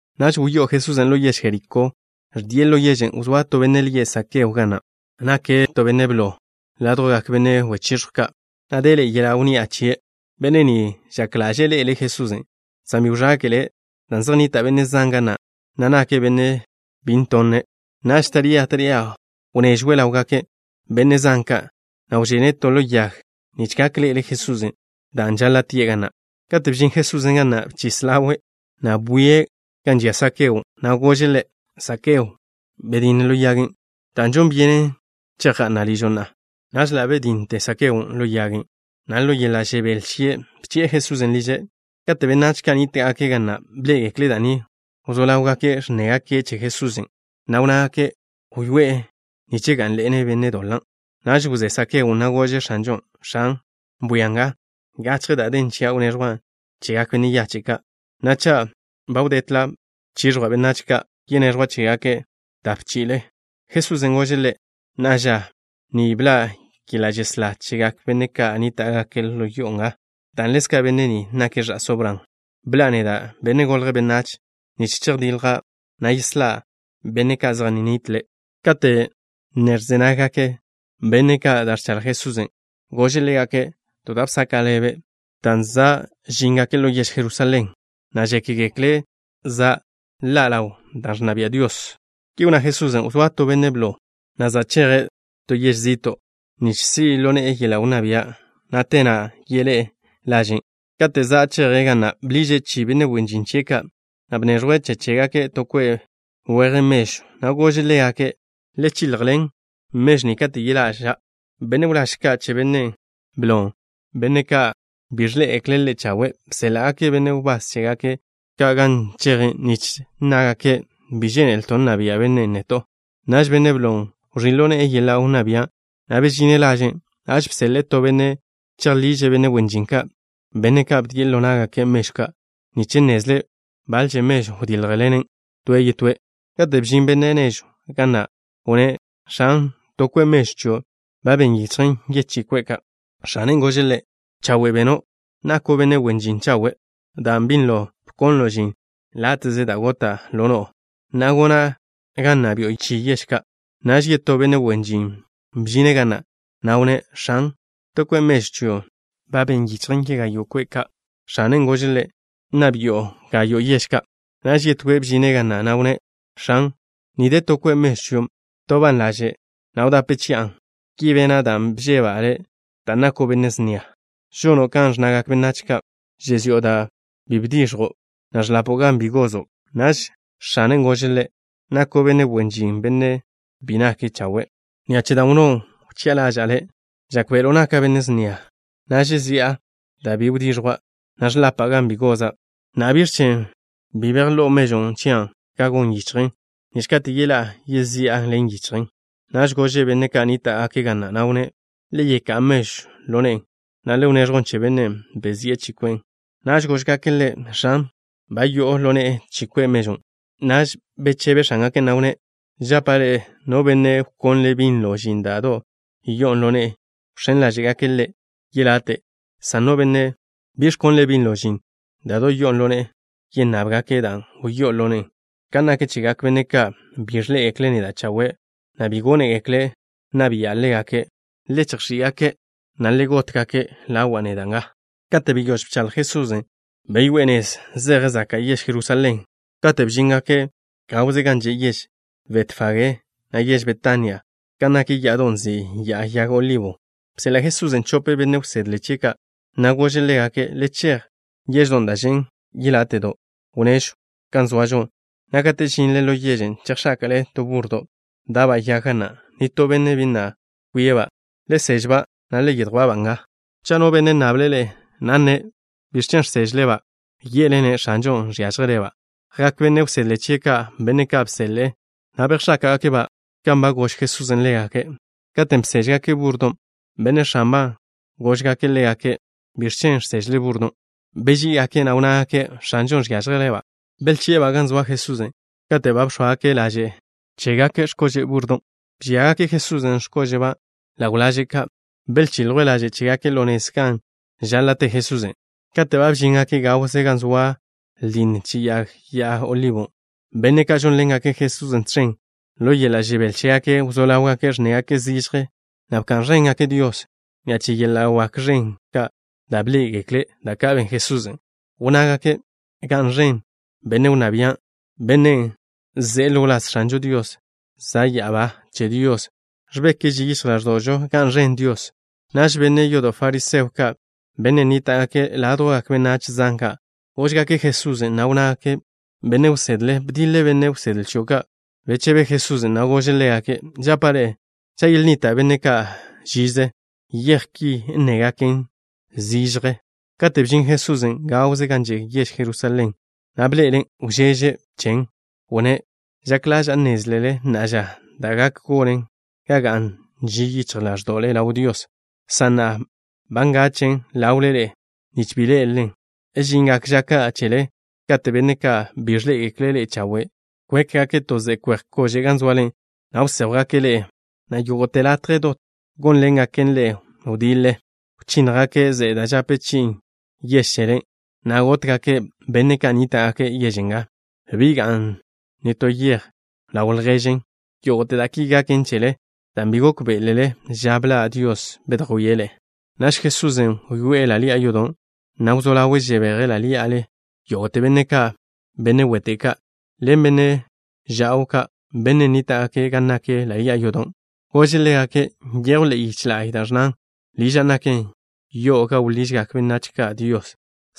Naž wyoé'e Jesusen' ḻo yež Jerikó, ẕdie' ḻo yežen'. Wzóa to benne' lie' Sakeo ga na'. Nake' benne' blo ládjwgak benne' wechiẕjw ka', na' deḻe'e yeḻa' wnni'a chie'. Benne' ni žak ḻaže'e ḻe'ele' Jesusen', san bi wẕáke'le' dan' zej nnita' benne' zan ga na', na' nake' benne' bi ntonne'. Naž taría taría wnežwe' ḻawgak benne' zan ka', na' wžene' to ḻo yag nich gak ḻe'ele' Jesusen', dan' žaḻa' tie' ga na'. Kate' bžin Jesusen' ga na', bchis ḻawe', na' bwie' gan žia Sakeon', na' gože' ḻe': —Zakeo, bedinne ḻo yagen', dan' žon byenen chejga'na' ližo' na'a. Naž ḻa' bedínnete Sakeon' ḻo yagen', na' ḻo yeḻa' žebél chie' bchi'e Jesusen' liže'. Kate' benách ka' nníta'gake' ga na' bḻé'egekle' da' ni, wzó ḻáwgake' ẕnnégake' che Jesusen', na' wnnágake': —Wyoé'e nich gá'nḻene' benne' doḻa'. Naž wzé Sakeon', na' gože' X̱anžon': —X̱an, bwia nga. Gachje da' den chia' wneẕjwa' chegak benne' yache' ka', na' cha' bi wdetle bchižjwa' benách ka', yeneẕjwa' chégake' tape chi'ile. Jesusen' gože' ḻe': —Na'a ža ni bḻa' yeḻa' žeslá chegak benne' ka' nníta'gake' ḻo yo'o nga, dan' ḻezka' benne' ni nake' ẕa'só Bran. Bḻa'a neda', Benne' Golje' Benách, nich zedjdilja', na' yeslá' benne' ka' zej nnitle'. Kate' ne ẕze naggak benne' ka' da' ẕchaḻj Jesusen', gože' ḻégake' to da' bsaka' ḻebe', dan' za' žíngake' ḻo yež Jerusalén, na' žékgekle' za' ḻa' dan' ẕnna bia' Dios. Ki wnná Jesusen': —Wzóa to benne' blo, na' za' cheje' to yež zi'to' nich si' ḻo ne'e yeḻa' wnná bia', na' te na' yeḻé'e laže'. Kate' za' cheje' ga na', bḻiže' chi benne' wen žin chie' ka', na' bneẕjwe' che chégake' to kwe' weje mežw, na' gože' ḻégake': “Le chiljḻen mežw ni kate' yeḻa'ža'.” Benne' wláž ka' che benne' blon', benne' ka' bi ẕḻé'egekle' ḻe' chawe', bséḻa'gake' benne' wbás chégake' ka' gan cheje', nich nnágake': “Bi žénelto' nna bia' bennen' neto'.” Naž benne' blon' wẕí' ḻo ne'e yeḻa' wnná bia', na' bežine' laže'. Naž bseḻe'e to benne' chejḻiže' benne' wen žin ka', benne' ka' bdie' ḻo ná'gake' mežw ka', nich nnezle' baḻẕe mežw wdíljḻenen' to toe'. Kate' bžin benne' nežw ga na', wnné': “X̱an, to kwe' mežw chion' ba ben yichjen yechí kwe' ka'.” X̱anen' gože' ḻe': “Chawe' beno'. Nako' benne' wen žin chawe'. Dan' binlo bkonlo' žin láte'ze da' gota' ḻo no'o, na'a gona' ga nna bi'o chi yež ka'.” Naž yetó benne' wen žin bžine' ga na', na' wnné': “X̱an, to kwe' mežw chion' ba ben yichjen yegayo' kwe' ka'.” X̱anen' gože' ḻe': “Nna bi'o gayo' yež ka'.” Naž yetóe' bžine' ga na', na' wnné': “X̱an, ni de to kwe' mežw chion'. Btoban' laže', na' wdape chi'an. Ki bena' dan' bžeba' le', dan' nako' benne' snia. Žono' kan ẕnnagak benách ka': žezi'o da' bi bdix̱jo', na' ẕḻapo' gan bi gozo'.” Naž x̱anen' gože' ḻe': “Nako' benne' wen žin bi nake' chawe'. Ni'a che da' wnnó' wchi'a ḻaža'a le'. Žákbe'elo' naka' benne' snia, na' žezi'a da' bi bdix̱jwa', na' ẕḻapa' gan bi goza'. Na'a, ¿biẕ chen' bi bejló'o mežw chian' gan gon yichjen, nich kate' yeḻá'a, yezi'an ḻen yichjen?” Naž gože' benne' ka' nníta'gake' ga na', na' wnné': “Le yeká'a mežwn' ḻo ne'e, na' le wneẕjwn che bennen' bezi'e chi kwe' mežwn'.” Naž góžgake' ḻe': “X̱an, ba yo'o ḻo ne'e chi kwe' mežw.” Naž bechebe x̱ángake', na' wnné': “Žapa' ḻe'e: no benne' wkonle' binlo žin da' do' yo'on ḻo ne'e, wx̱én ḻáže'gake' ḻe' yelate', san no benne' bi ẕkonle' binlo žin da' do' yo'on ḻo ne'e, yennábgake' dan' wyó'on ḻo ne'e. Kan nak chegak benne' ka' bi ẕḻé'egekle' neda' chawe', na' bi gónegekle' nna bi'a ḻégake', le chejx̱í'-gake', na' le got-gake' ḻawa' neda' nga.” Kate' beyóž bchaḻj Jesusen', beyoé'e nez zeje' zaka' yež Jerusalén. Kate' bžíngake' gawze gan že' yež Betfagé, na' yež Betania, gan nak ya'adon' nzin' Ya'a Yag Olibo, bseḻa' Jesusen' chope benne' wsedle chie' ka', na' gože' ḻégake': —Le chej yeždon' da' žen' yeláte'do' wnežw gan zoažo, na' katen' žinle ḻo yežen', chejx̱áka'le to búrrodo' da'ba' yag, na' nitó benne' bi na' kwie'-ba'. Le sež-ba', na' le yedjwá'-ba' nga. Cha' no benne' nnable' ḻe'e, na' nne': “¿Biẕ chen' žsežle-ba'?” ye'le-ne': “X̱anžon' žiážjele'-ba'.” Jak benne' wsedle chie' ka', benne' ka' bseḻe'e, na' bejx̱áka'gake'-ba' kan ba gož Jesusen' ḻégake'. Katen' beséžgake' búrrodon', benne' x̱anba' ka' góžgake' ḻégake': —¿Biẕ chen' žsežle búrrodon'? Beží'igake', na' wnnágake': —X̱anžon' žiážjele'-ba'. Belchi'e-ba' gan zoa Jesusen'. Kate' ba bx̱óagake' laže' cheḻá'a ka' chégake' x̱kože' búrrodon', bžíagake' Jesusen' x̱kóže'ba' ḻaw laže' ka'. Belchiljwe' laže' chégake' ḻo nez gan žaḻa' te Jesusen'. Kate' ba bžíngake' gawze gan zoa ldinne che Ya'a Yag Olibo, benne' ka' žónḻengake' Jesusen' tẕen, ḻo yeḻa' žebél chégake', wzó ḻáwgake' ẕnnégake' zižje, na' bka'n ẕéngake' Dios ni'a che yeḻa' wak ẕen ka' da' bḻé'egekle', da' ka' ben Jesusen'. Wnnágake': —¡Ga'n ẕen benne' wnná bia' ni, benne' ze'e ḻo wláz X̱anžo Dios! ¡Za' ya'abá che Dios da' ẕbek ži yichj ḻáẕdo'žo! ¡Ga'n ẕen Dios! Naž benne' yodo' fariseo ka', benne' nníta'gake' ládjwgak benách zan ka', góžgake' Jesusen', na' wnnágake': —Benne' wsedle, bdiḻe benne' wsedle chio' ka'. Bechebe Jesusen', na' gože' ḻégake': —Žapa' ḻe'e: cha' yelnnita' benne' ka' žize, yej ki nnégaken zižje. Katen' bžin Jesusen' gawze gan že' yež Jerusalén, na' bḻe'elen', wžeže' chen. Wnné': —Žak ḻaža'a nnézlele na'a ža da' gak gonen ga ga'n ži yichj ḻáẕdo'le ḻaw Dios, san na'a ba ngachen' ḻawle ḻe'e, nich bi ḻé'elelen. Žingak ža ka' chele kate' benne' ka' bi ẕḻé'egekle' ḻe'e chawe', kwékgake' to ze'e kwe'j kože' gan zoale, na' wséjwgake' ḻe'e, na' yógo'te latje dot gawze gónḻengake' ḻe'e wdiḻe. Wchínnjgake' ze'e da' žape chi'in yež chele, na' gótgake' benne' ka' nníta'gake' yež nga. Bi ga'n to yej ḻaw lježen. Yógo'te da' ki gaken chele dan' bi gókbe'elele ža bḻa' Dios bedjwíe' ḻe'e. Naž Jesusen' wyoé'e ḻa' ḻi'a yodo', na' wzó ḻawe' žebeje' ḻí'ale yógo'te benne' ka', benne' wete' ka' ḻen benne' ža'w ka', benne' nníta'gake' gan nak ḻa' ḻi'a yodon'. Gože' ḻégake': —Nyejw ḻe'e yich la'y da' ẕnnan: “Liža' naken yo'o gan wḻižgak benách ka' Dios”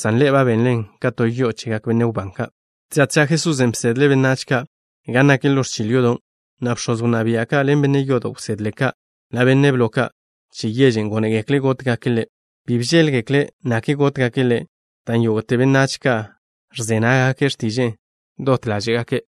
san ḻe'e ba benlen ka to yo'o chegak benne' wbán ka'. Tža tža Jesusen' bsedle' benách ka' gan nak ḻo ẕchil yodon', na' bx̱oz wnná bia' ka', ḻen benne' yodo' wsedle ka', na' benne' blo ka' che yež gónegekle' gótgake' Ḻe'. Bi bžéḻgekle' nakle gótgake' Ḻe', dan' yógo'te benách ka' ẕze nággake' x̱tiže'e dot ḻáže'gake'.